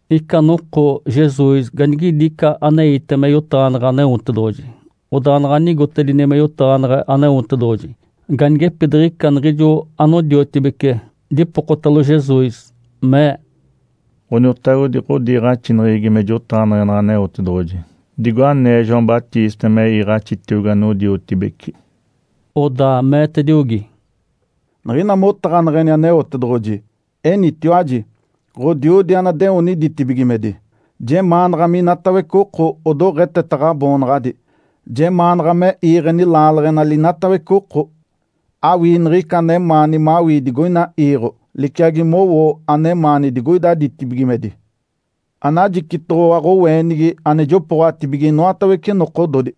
Ica noko Jesus ganigidi ica aneite me yotaɡ̶aneɡ̶e Aneotedoɡ̶oji. Odaa naɡ̶a nigotedini me yotaɡ̶aneɡ̶e Aneotedoɡ̶oji, ganigepidiɡ̶ica niɡ̶ijo anodiotibece dipokotalo Jesus, mee, “Ǥoniotagodi, ɡ̶odiiɡ̶axineɡ̶egi me jotaɡ̶aneɡ̶enaɡ̶a Aneotedoɡ̶oji, digo anee João Batista me iiɡ̶axitiogi anodiotibeci.” Odaa meetediogi, “Niɡ̶ina motaɡ̶aneɡ̶eni Aneotedoɡ̶oji, enitiwaji, ‘Ǥodiodi anadeoni ditibigimedi, jemaanaɡ̶a minatawece oko odoɡ̶eteta Ǥaboonaɡ̶adi. Jemaanaɡ̶a me iiɡ̶eni laaleɡ̶enali inatawece oko. Awii niɡ̶ica anemaani mawii digoina iiɡ̶o, liciagi mowo anemaani digoida ditibigimedi. Anajicitoɡ̶owa ɡ̶oweenigi ane jopooɡ̶atibige inoatawece nokododi.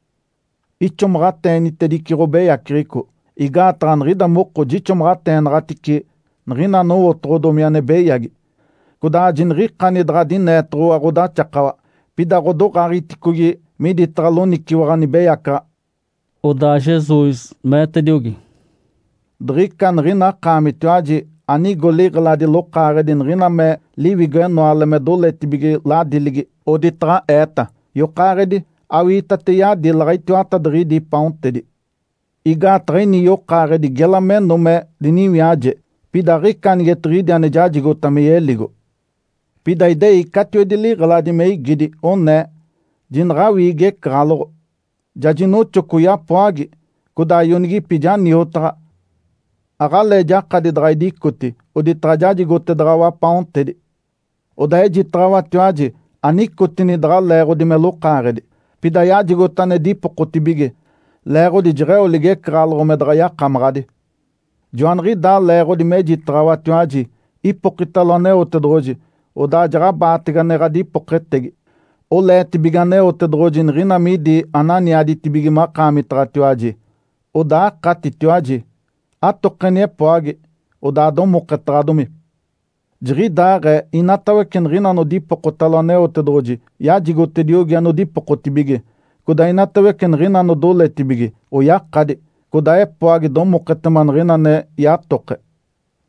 Ixomaɡ̶ateenitedice ɡ̶obeyaceɡ̶eco, igaataɡ̶a niɡ̶ida moko jixomaɡ̶ateenaɡ̶atice niɡ̶ina anowotoɡ̶odomi ane beyagi. Codaa jiniɡ̶ikani daɡ̶a dineetoɡ̶owa ɡ̶odaxakawa. Pida ɡ̶odoɡ̶aaɡ̶egiticogi miditaɡ̶a loniciwaɡ̶a nibeyacaɡ̶a.’” Odaa Jesus meetediogi, “Diɡ̶ica niɡ̶ina akaamitiwaji anigo liɡ̶eladi lokaaɡ̶edi niɡ̶ina me liwigo-enoale me doletibige ladiligi, oditaɡ̶a eeta, ‘Yokaaɡ̶edi, awiitate yadilaɡ̶a itiwatadiɡ̶idi paontedi. Igaataɡ̶a ini yokaaɡ̶edi gela meno me diniwiaje, pida aɡ̶ica anigetiɡ̶idi ane jajigota me yeligo.’ Pida idei catiwedi liɡ̶eladi me igidi, onee, ‘Jinaɡ̶awii igecaɡ̶aloɡ̶o! Ja jinoxoco yapoagi, codaa ionigipi ja niotaɡ̶a, aɡ̶alee jakadi daɡ̶a idicoti oditaɡ̶a jajigotedaɡ̶awa paontedi.’ Odaa ejitaɡ̶awatiwaji anicotini daɡ̶a leeɡ̶odi me lokaaɡ̶edi, pida yajigota ane dipokotibige, leeɡ̶odi jeɡ̶eo ligecaɡ̶aloɡ̶o me daɡ̶a yakamaɡ̶adi. Joaniɡ̶idaa leeɡ̶odi mejitaɡ̶awatiwaji, ipokitalo Aneotedoɡ̶oji, odaa jaɡ̶abaatege ane ɡ̶adipoketegi. Oleetibige Aneotedoɡ̶oji niɡ̶ina midi ananiaditibige makaamitaɡ̶atiwaji, odaa akatitiwaji. Atokeni epoagi, odaa domoketaɡ̶adomi. Jiɡ̶idaaɡ̶ee inatawece niɡ̶ina anodipokotalo Aneotedoɡ̶oji, yajigotediogi anodipokotibige, codaa inatawece niɡ̶ina anodoletibige, oyakadi. Codaa epoagi domoketema niɡ̶ina ane yatoke.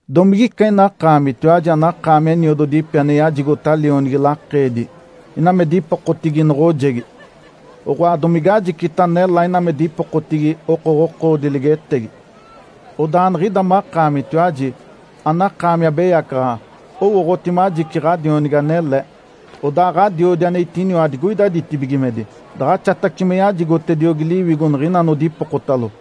Domigica ina akaamitiwaji anakaami eniododipi ane yajigota lionigi lakeedi, ina me dipokotigi noɡ̶ojegi? Oɡ̶oa, domige ajicita nelá ina me dipokotigi okoɡ̶okoodi ligetegi? Odaa niɡ̶ida makaamitiwaji, anakaami abeyacaɡ̶aɡ̶a, owooɡ̶oti majici ɡ̶adionigi anele. Odaa Ǥadiodi ane itiniwa digoida ditibigimedi daɡ̶axatace me yajigotediogi Liwigo niɡ̶ina anodipokotalo!”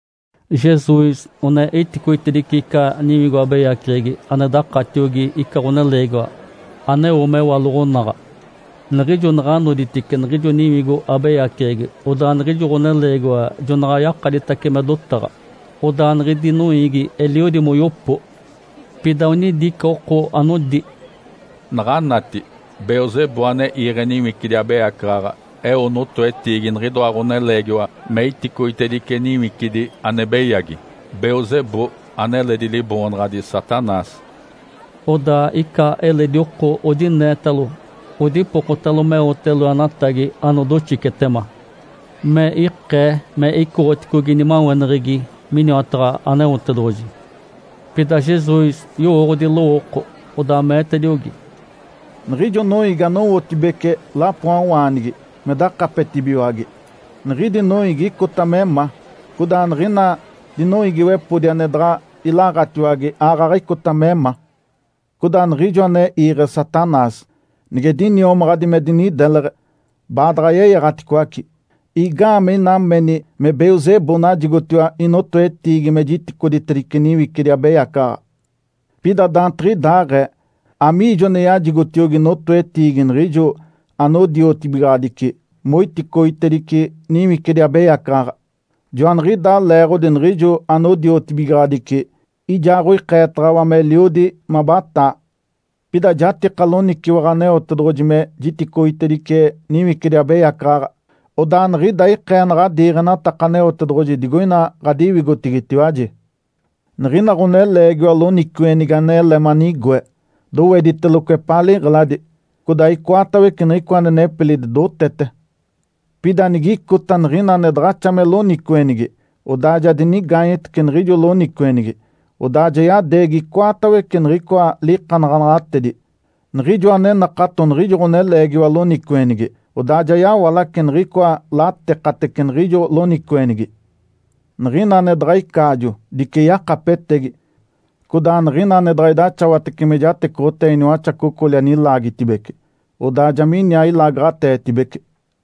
Jesus one iticoitedice ica niwigo abeyaceɡ̶egi ane dakatiogi ica ɡ̶oneleegiwa, aneo mewaloɡ̶onaɡ̶a. Niɡ̶ijo naɡ̶a noditice niɡ̶ijo niwigo abeyaceɡ̶egi, odaa niɡ̶ijo ɡ̶oneleegiwa jonaɡ̶a yakaditace me dotaɡ̶a. Odaa niɡ̶idi noiigi eliodi moyopo. Pida onidi ica oko anodi, “Naɡ̶anati! Belzebu ane iiɡ̶e niwicidi abeyacaɡ̶aɡ̶a eo notoetiigi niɡ̶idoa ɡ̶oneleegiwa me iticoitedice niwicidi ane beyagi. (Belzebu aneledi liboonaɡ̶adi Satanás).” Odaa ica eledi oko odineetalo odipokotalo meote loenatagi anodoxicetema, me ikee me icoɡ̶oticogi nimaweneɡ̶egi miniwataɡ̶a Aneotedoɡ̶oji. Pida Jesus yowooɡ̶odi lowooko, odaa meetediogi, “Niɡ̶ijo noiigi anowotibece lapoawaanigi me dakapetibigiwage, niɡ̶idi noiigi icota me ma. Codaa niɡ̶ina dinoiigiwepodi ane daɡ̶a ilaɡ̶atiwage aaɡ̶aɡ̶a icota me ma. Codaa niɡ̶ijo ane iiɡ̶e Satanás, nige diniomaɡ̶adi me dinideleɡ̶e, baadaɡ̶a yeyaɡ̶aticoace. Igaamee ina meni me Belzebu najigotiwa inotoetiigi me jiticoitedice niwicidi abeyacaɡ̶aɡ̶a? Pida daantiɡ̶idaaɡ̶ee, amiijo ane yajigotiogi notoetiigi niɡ̶ijo anodiotibigaɡ̶adici moiticoitedice niwicidi abeyacaɡ̶aɡ̶a? Joaniɡ̶idaa leeɡ̶odi niɡ̶ijo anodiotibigaɡ̶adici ijaaɡ̶oikeetaɡ̶awa meliodi mabataa. Pida jatika loniciwaɡ̶a Aneotedoɡ̶oji me jiticoitedice niwicidi abeyacaɡ̶aɡ̶a. Odaa niɡ̶ida ikee naɡ̶a diiɡ̶enataka Aneotedoɡ̶oji digoina ɡ̶adiwigotigitiwaji. Niɡ̶ina ɡ̶oneleegiwa loniciweɡ̶enigi anele manigoe, dowediteloco epaa liɡ̶eladi, codaa icoatawece niɡ̶icoa ane nepilidi dotete. Pida nigicota niɡ̶ina ane daɡ̶axa me loniciweɡ̶enigi, odaa ja dinigaanyetece niɡ̶ijo loniciweɡ̶enigi, odaa ja yadeegi icoatawece niɡ̶icoa likanaɡ̶anaɡ̶atedi, niɡ̶ijoa ane nakato niɡ̶ijo ɡ̶oneleegiwa loniciweɡ̶enigi. Odaa ja yawalace niɡ̶icoa latekatece niɡ̶ijo loniciweɡ̶enigi. Niɡ̶ina ane daɡ̶a icaajo, dice yakapetegi, codaa niɡ̶ina ane daɡ̶a idaxawatece me jatecoɡ̶otee iniwaxacocoli anilaagitedibece, odaa ja miniaa ilaagaɡ̶aditedibece.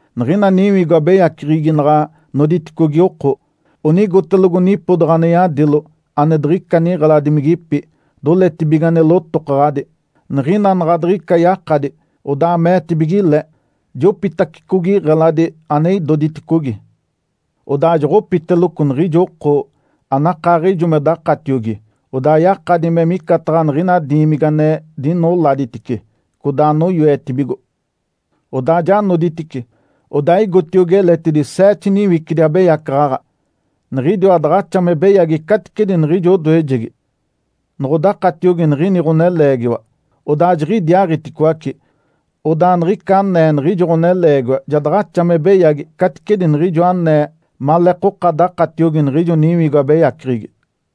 Niɡ̶ina niwigo abeyaceɡ̶egi naɡ̶a noditicogi oko, onigotelogo nipodaɡ̶a ane yadilo, ane diɡ̶ica niɡ̶eladimigipi, doletibige ane lotokaɡ̶adi. Niɡ̶ina naɡ̶a diɡ̶ica yakadi, odaa meetibige le, ‘Jopitacicogi iɡ̶eladi ane idoditicogi.’ Odaa joɡ̶opitaceloco niɡ̶ijo oko, anakaaɡ̶ijo me dakatiogi, odaa yakadi me micataɡ̶a niɡ̶ina diimigi ane dinoladitice, codaa anoyoetibigo. Odaa ja noditice, odaa igotiogi eletidi seete niwicidi abeyacaɡ̶aɡ̶a, niɡ̶idiwa daɡ̶axa me beyagi caticedi niɡ̶ijo odoejegi. Noɡ̶odakatiogi niɡ̶ini ɡ̶oneleegiwa, odaa jiɡ̶idiaaɡ̶iticoace. Odaa niɡ̶ica anee niɡ̶ijo ɡ̶oneleegiwa ja daɡ̶axa me beyagi caticedi niɡ̶ijo anee maleekoka dakatiogi niɡ̶ijo niwigo abeyaceɡ̶egi.”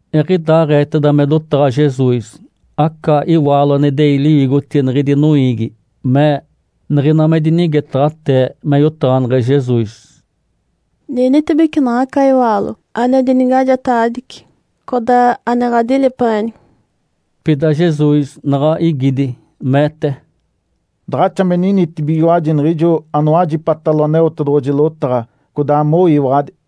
Eɡ̶idaaɡ̶eeteda me dotaɡ̶a Jesus, aca iwaalo ane idei liwigotigi niɡ̶idi noiigi mee, niɡ̶ina me dinigetaɡ̶atee me yotaɡ̶aneɡ̶e Jesus, “Ninitibece naɡ̶aca iwaalo ane dinigajetaɡ̶adici, codaa ane ɡ̶adilipeɡ̶eni!” Pida Jesus naɡ̶a igidi, meete, “Daɡ̶axa me ninitibigiwaji niɡ̶ijo anowajipatalo Aneotedoɡ̶oji lotaɡ̶a, codaa moyiwaɡ̶adi.”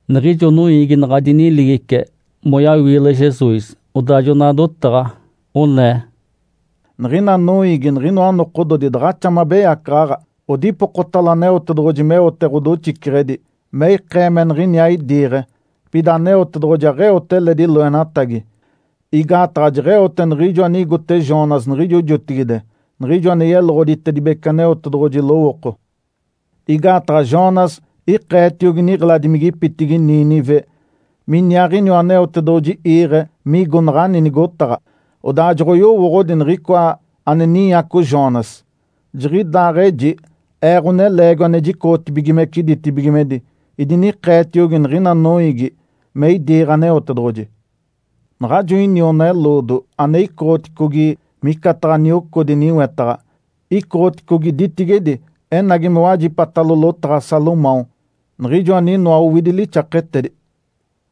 Niɡ̶ijo noiigi naɡ̶a diniligice, moyawiile Jesus, odaa jona dotaɡ̶a onee, “Niɡ̶ina noiigi niɡ̶inoa nokododi daɡ̶axa me abeyacaɡ̶aɡ̶a. Odipokotalo Aneotedoɡ̶oji meote ɡ̶odoxiceɡ̶edi me ikee me niɡ̶iniaa idiiɡ̶e. Pida Aneotedoɡ̶oji aɡ̶eote eledi loenatagi, igaataɡ̶a jeɡ̶eote niɡ̶ijo anigote Jonas niɡ̶ijo jotigide, niɡ̶ijo ane yeloɡ̶oditedibece Aneotedoɡ̶oji lowooko. Igaataɡ̶a Jonas ikeetiogi niɡ̶eladimigipitigi Nínive miniaaɡ̶iniwa Aneotedoɡ̶oji iiɡ̶e migo naɡ̶ani nigotaɡ̶a, odaa joɡ̶oyowooɡ̶odi niɡ̶icoa ane ninyaco Jonas. Jiɡ̶idaaɡ̶eji Ee, Ǥoneleegiwa ane jicoɡ̶otibigimece ditibigimedi, idinikeetiogi niɡ̶ina noiigi me idiiɡ̶e Aneotedoɡ̶oji. Naɡ̶ajo iniona-eloodo ane icoɡ̶oticogi micataɡ̶a niocodi niwetaɡ̶a, icoɡ̶oticogi ditigedi enagi me wajipatalo lotaɡ̶a Salomão, niɡ̶ijo aninoa owidi lixaketedi.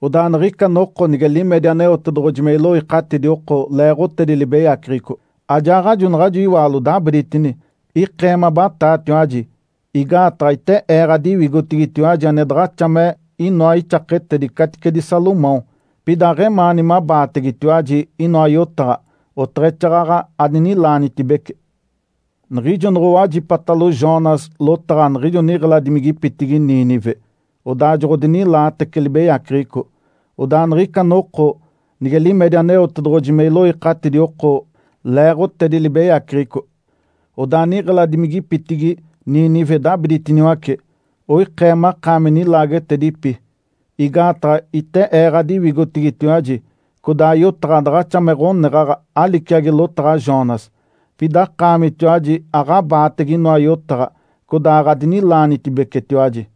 Odaa niɡ̶ica noko nige limedi Aneotedoɡ̶oji me iloikatidi oko leeɡ̶otedi libeyaceɡ̶eco, ajaaɡ̶ajo naɡ̶ajo iwaalo dabiditini, ikee me abataatiwaji, igaataɡ̶a ite Ee ɡ̶adiwigotigitiwaji ane daɡ̶axa me inoa ixaketedi caticedi Salomão. Pida aɡ̶emaani mabaategetiwaji inoa yotaɡ̶a, oteɡ̶exaaɡ̶aɡ̶a adinilaanitibece. Niɡ̶ijo noɡ̶owajipatalo Jonas lotaɡ̶a niɡ̶ijo niɡ̶eladimigipitigi Nínive, odaa joɡ̶odinilaatece libeyaceɡ̶eco. Odaa niɡ̶ica noko nige limedi Aneotedoɡ̶oji me iloikatidi oko leeɡ̶otedi libeyaceɡ̶eco, odaa niɡ̶eladimigipitigi Nínive dabiditiniwace, oikee makaami nilaagetedipi, igaataɡ̶a ite Ee ɡ̶adiwigotigitiwaji, codaa yotaɡ̶a daɡ̶axa me ɡ̶oneɡ̶aɡ̶a aliciaco lotaɡ̶a Jonas. Pida akaamitiwaji aɡ̶abaatege inoa yotaɡ̶a, codaa aɡ̶adinilaanitibecetiwaji.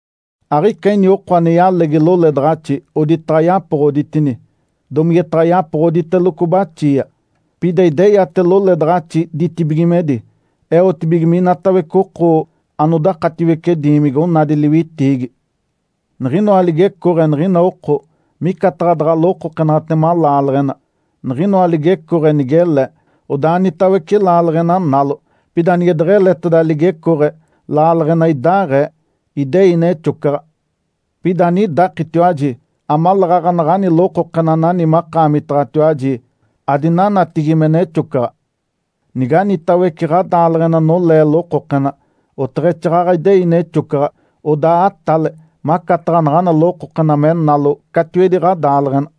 Aɡ̶ica ini oko ane yalegi loledaɡ̶axi oditaɡ̶a yapoɡ̶oditini, domigetaɡ̶a yapoɡ̶oditeloco baxia. Pida ideyate loledaɡ̶axi ditibigimedi, eotibige minatawece oko anodakatiwece diimigi onadi liwitiigi. Niɡ̶inoa ligecooɡ̶e niɡ̶ina oko micataɡ̶a daɡ̶a lokokenatema laaleɡ̶ena. Niɡ̶inoa ligecooɡ̶e nigele, odaa anitawece laaleɡ̶ena nalo. Pida nige deɡ̶eleteda ligecooɡ̶e, laaleɡ̶ena idaaɡ̶ee, idei nexocaɡ̶a. Pida anidakitiwaji, amaleeɡ̶aɡ̶a naɡ̶ani lokokena anani makaamitaɡ̶atiwaji adinanatigi me nexocaɡ̶a. Niganitawece ɡ̶adaaleɡ̶ena nolee lokokena, oteɡ̶exaaɡ̶aɡ̶a idei nexocaɡ̶a, odaa atale macataɡ̶a naɡ̶ana lokokena me nalo catiwedi ɡ̶adaaleɡ̶ena.”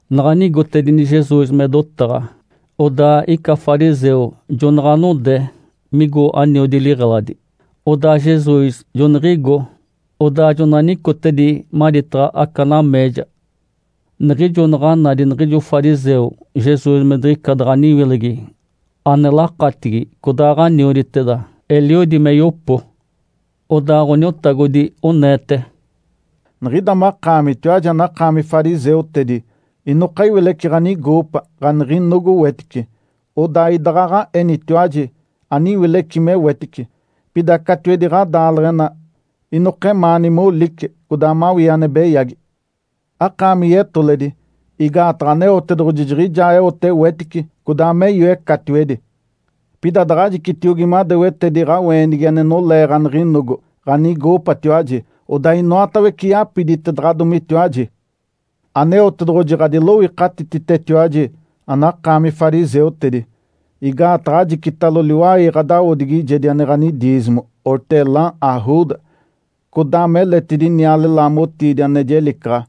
Naɡ̶a nigotedini Jesus me dotaɡ̶a, odaa ica fariseu jonaɡ̶a node migo aniodi liɡ̶eladi. Odaa Jesus joniɡ̶igo, odaa jona nicotedi maditaɡ̶a aca nameeja. Niɡ̶ijo naɡ̶a nadi niɡ̶ijo fariseu Jesus me diɡ̶ica daɡ̶a aniwilegi ane lakatigi codaaɡ̶anioditeda, eliodi me yopo. Odaa Ǥoniotagodi oneete, “Niɡ̶ida makaamitiwaji anakaami fariseutedi, inoka iwileci ɡ̶anigoopa, ɡ̶aniɡ̶inogo wetice. (Odaa idaɡ̶aɡ̶a enitiwaji aniwileci me wetice.) Pida catiwedi ɡ̶adaaleɡ̶ena, inokemaani molice, codaa mawii ane beyagi. Akaami yetoledi! Igaataɡ̶a Aneotedoɡ̶oji jiɡ̶ijaa eote wetice, codaa me yoe catiwedi. Pida daɡ̶ajicitiogi madewetedi ɡ̶aweenigi ane nolee ɡ̶aniɡ̶inogo, ɡ̶anigoopatiwaji. Odaa inoatawece yapiditedaɡ̶adomitiwaji. Aneotedoɡ̶oji ɡ̶adiloikatititetiwaji anakaami fariseutedi! Igaataɡ̶a ajicitalo liwai ɡ̶adawodigijedi ane ɡ̶anidiizimo, ‘hortelã’, ‘arruda’, codaa meletidi niale-laamotiidi ane jelicaɡ̶a.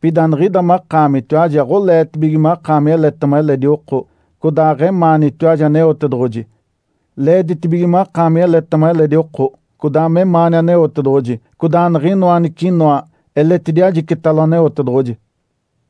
Pida niɡ̶ida makaamitiwaji aɡ̶oleetibige makaami eletema eledi oko, codaa aɡ̶emaanitiwaji Aneotedoɡ̶oji. Leeditibige makaami eletema eledi oko, codaa memaani Aneotedoɡ̶oji, codaa niɡ̶inoa anicinoa eletidi ajicitalo Aneotedoɡ̶oji.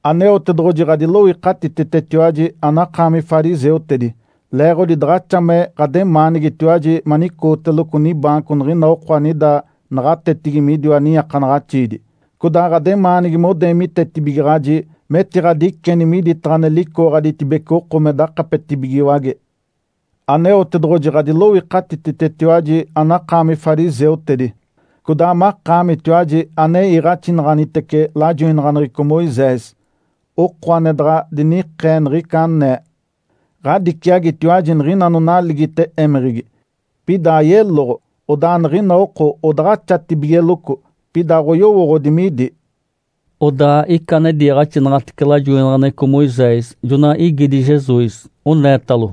Aneotedoɡ̶oji ɡ̶adiloikatititetiwaji anakaami fariseutedi! Leeɡ̶odi daɡ̶axa me ɡ̶ademaanigitiwaji manicooteloco nibaanco niɡ̶ina oko anida naɡ̶atetigi midiwa niiakanaɡ̶axiidi, codaa ɡ̶ademaanigi modeemitetibigaɡ̶aji metiɡ̶adiceni miditaɡ̶a ane licooɡ̶aditibece oko me dakapetibigiwage. Aneotedoɡ̶oji ɡ̶adiloikatititetiwaji anakaami fariseutedi, codaa makaamitiwaji ane iiɡ̶axinaɡ̶anitece lajoinaɡ̶aneɡ̶eco Moisés, oko ane daɡ̶a dinikee niɡ̶ica anee. Ǥadiciagitiwaji niɡ̶ina anonaligite émeɡ̶egi, pida ayeloɡ̶o, odaa niɡ̶ina oko odaɡ̶axatibigeloco, pida aɡ̶oyowooɡ̶odi midi.” Odaa ica ane diiɡ̶axinaɡ̶atece lajoinaɡ̶aneɡ̶eco Moisés jona igidi Jesus, oneetalo,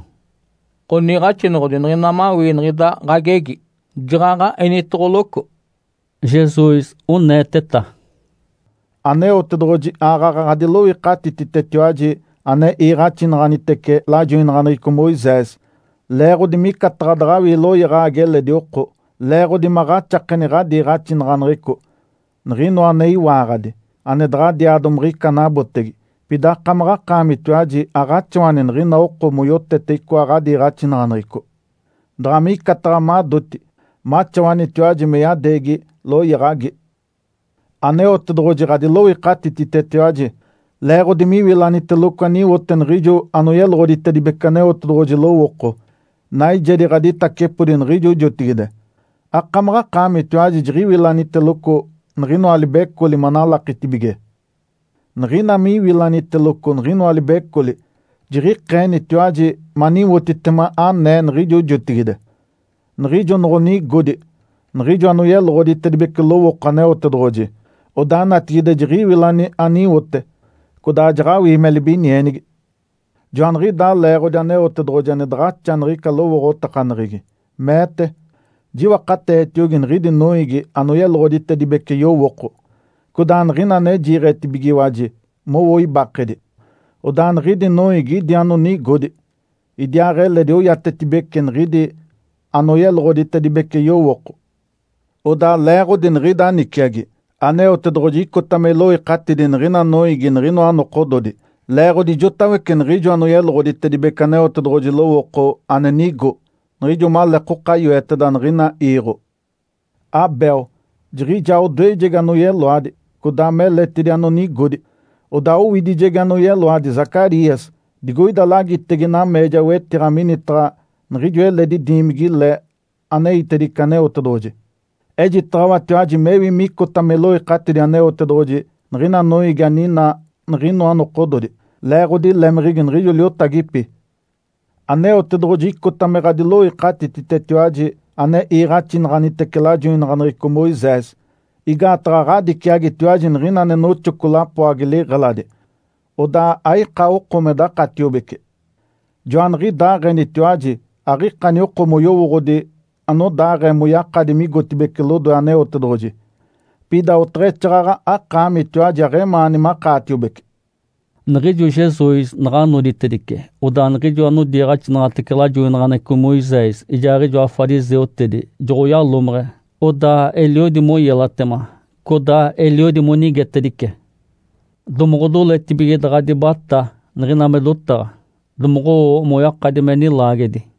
“Ǥoniiɡ̶axinoɡ̶odi, niɡ̶ina mawii niɡ̶ida ɡ̶agegi, jaɡ̶aɡ̶a enitoɡ̶oloco.” Jesus oneeteta, “Aneotedoɡ̶oji aaɡ̶aɡ̶a ɡ̶adiloikatititetiwaji ane iiɡ̶axinaɡ̶anitece lajoinaɡ̶aneɡ̶eco Moisés. Leeɡ̶odi micataɡ̶a daɡ̶awii loyaɡ̶agi eledi oko, leeɡ̶odi maɡ̶axakeni ɡ̶adiiɡ̶axinaɡ̶aneɡ̶eco, niɡ̶inoa ane iwaaɡ̶adi, ane daɡ̶adiaa domiɡ̶ica anabotege. Pida akamaɡ̶akaamitiwaji aɡ̶axawani niɡ̶ina oko moyotete icoa ɡ̶adiiɡ̶axinaɡ̶aneɡ̶eco daɡ̶a micataɡ̶a madoti maxawanitiwaji me yadeegi loyaɡ̶agi. Aneotedoɡ̶oji ɡ̶adiloikatititetiwaji leeɡ̶odi miwilaniteloco aniwote niɡ̶ijo anoyeloɡ̶oditedibece Aneotedoɡ̶oji lowooko naijedi ɡ̶aditacepodi niɡ̶ijo jotigide. Akamaɡ̶akaamitiwaji jiɡ̶iwilaniteloco niɡ̶inoa libecoli manalakitibige. Niɡ̶ina miwilaniteloco niɡ̶inoa libecoli, jiɡ̶ikeenitiwaji maniwotitema anee niɡ̶ijo jotigide, niɡ̶ijo noɡ̶onigodi niɡ̶ijo anoyeloɡ̶oditedibece lowooko Aneotedoɡ̶oji. Odaa natigide jiɡ̶iwilani aniwote, codaa jaɡ̶awii me libinienigi. Joaniɡ̶idaa leeɡ̶odi Aneotedoɡ̶oji ane daɡ̶axa niɡ̶ica lowooɡ̶otakaneɡ̶egi, meete, ‘Jiwakateetiogi niɡ̶idi noiigi anoyeloɡ̶oditedibece yowooko, codaa niɡ̶ina ane jiiɡ̶etibigiwaji mowo ibakedi. Odaa niɡ̶idi noiigi idi anonigodi, idiaaɡ̶eledi oiatetibeci niɡ̶idi anoyeloɡ̶oditedibece yowooko.’ Odaa leeɡ̶odi niɡ̶ida niciagi, Aneotedoɡ̶oji icota me iloikatidi niɡ̶ina noiigi niɡ̶inoa nokododi, leeɡ̶odi ijotawece niɡ̶ijo anoyeloɡ̶oditedibece Aneotedoɡ̶oji lowooko ane nigo, niɡ̶ijo maleekoka yoeteda niɡ̶ina iiɡ̶o. Abel, jiɡ̶ijaa odoejegi anoyeloadi, codaa me eletidi anonigodi, odaa owidijegi anoyeloadi Zacarias digoida lagitege nameeja wetiɡ̶a minitaɡ̶a niɡ̶ijo eledi diimigi-le aneitedice Aneotedoɡ̶oji. Ejitaɡ̶awatiwaji mewi micota me iloikatidi Aneotedoɡ̶oji niɡ̶ina noiigi aninaa niɡ̶inoa nokododi, leeɡ̶odi lemeɡ̶egi niɡ̶ijo liotagipi. Aneotedoɡ̶oji icota me ɡ̶adiloikatititetiwaji ane iiɡ̶axinaɡ̶anitece lajoinaɡ̶aneɡ̶eco Moisés. Igaataɡ̶a ɡ̶adiciagitiwaji niɡ̶ina ane noxoco lapoagi liɡ̶eladi, odaa aika oko me dakatiobece. Joaniɡ̶idaaɡ̶enitiwaji aɡ̶ikani oko moyowooɡ̶odi anodaaɡ̶ee moyakadi migotibeci lodoe Aneotedoɡ̶oji, pida oteɡ̶exaaɡ̶aɡ̶a akaamitiwaji aɡ̶emaani makaatiobece.” Niɡ̶ijo Jesus naɡ̶a noditedice, odaa niɡ̶ijo anodiiɡ̶axinaɡ̶atece lajoinaɡ̶aneɡ̶eco Moisés ijaaɡ̶ijoa fariseutedi joɡ̶oyalomeɡ̶e. Odaa eliodi moyelatema, codaa eliodi monigetedice. Domoɡ̶odoletibige daɡ̶a dibatá niɡ̶ina me dotaɡ̶a, domoɡ̶owo moyakadi me nilaagedi.